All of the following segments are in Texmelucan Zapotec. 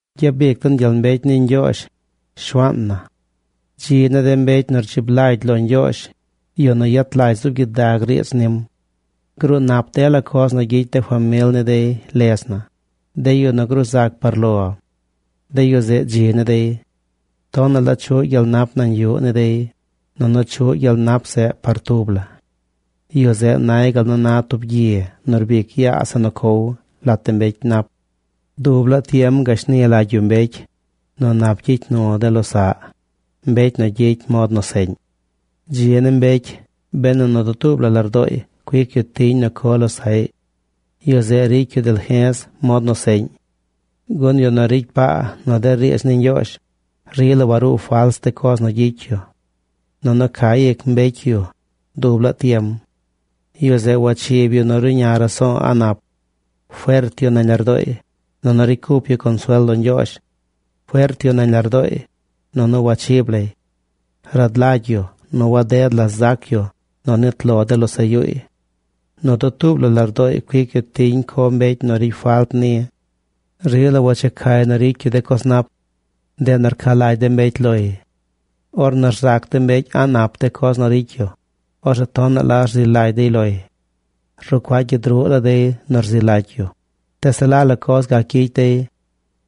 ¡Gyabic den gyel mbecy ni Ñgyoozh, Shuaan na! Dzi ni de mbecy nu rdzib lagy lo Ñgyoozh, yu nu yet lagy zuub gyidag riidz nim. Gruu nap dela coz nu gyicy de famil ni dey ledz na, de yu nu gruu zac par lo. De yu zeꞌ dzi ni dey. Tonaꞌ la chuꞌ gyel nap nañ yuꞌ ni dey, nunu chuꞌ gyel nap zeꞌ par tub la. Yu zeꞌ nay gal nu na tub gyi nu rbic yaa zeꞌ nu cow lat de mbecy nap. Dub laa tiem gashni lagy yu mbecy nu nap gyicy nu de losaꞌy, mbecy nu gyicy mod nu seꞌñ. Dzi ni mbecy benu nu dutuub la lardooy cuic yu tiñ nu co losaꞌy. Yu zeꞌ ricy yu dalje̱z mod nu seꞌñ. Gun yu nu ricy paa nu de riidz ni Ñgyoozh, rila waruu fals de coz nu gyicy yu. Nunu ca ic mbecy yu dub laa tiem. Yu zeꞌ wachib yu nu ruꞌña raso̱o̱ a̱ꞌ nap. Fert yu nañ lardooy, nunu ricy cup yu consuel lo Ñgyoozh. Fert yu nañ lardooy, nunu wachib lay. Rad lagy yu nu waded la zac yu nu nit lo de losaꞌ yuuy. Nu dutuub la lardooy cuic yu tiñ co mbecy nu ricy falt ni. Rila wachecay nu ricy yu de coz nap. Ndeꞌ nu rca lagy de mbecy loy. Ornu rzac de mbecy a̱ꞌ nap de coz nu ricy yu, orzeꞌ tonaꞌ la nu rzi lagy dey loy. Rucuaꞌ gyid ruꞌ la dey nu rzi lagy yu, tees se la coz gac gyicy dey.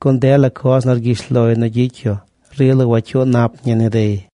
Gun dela coz nu rgyish loy nu gyicy yu rila wacyuu nap ñi ni dey.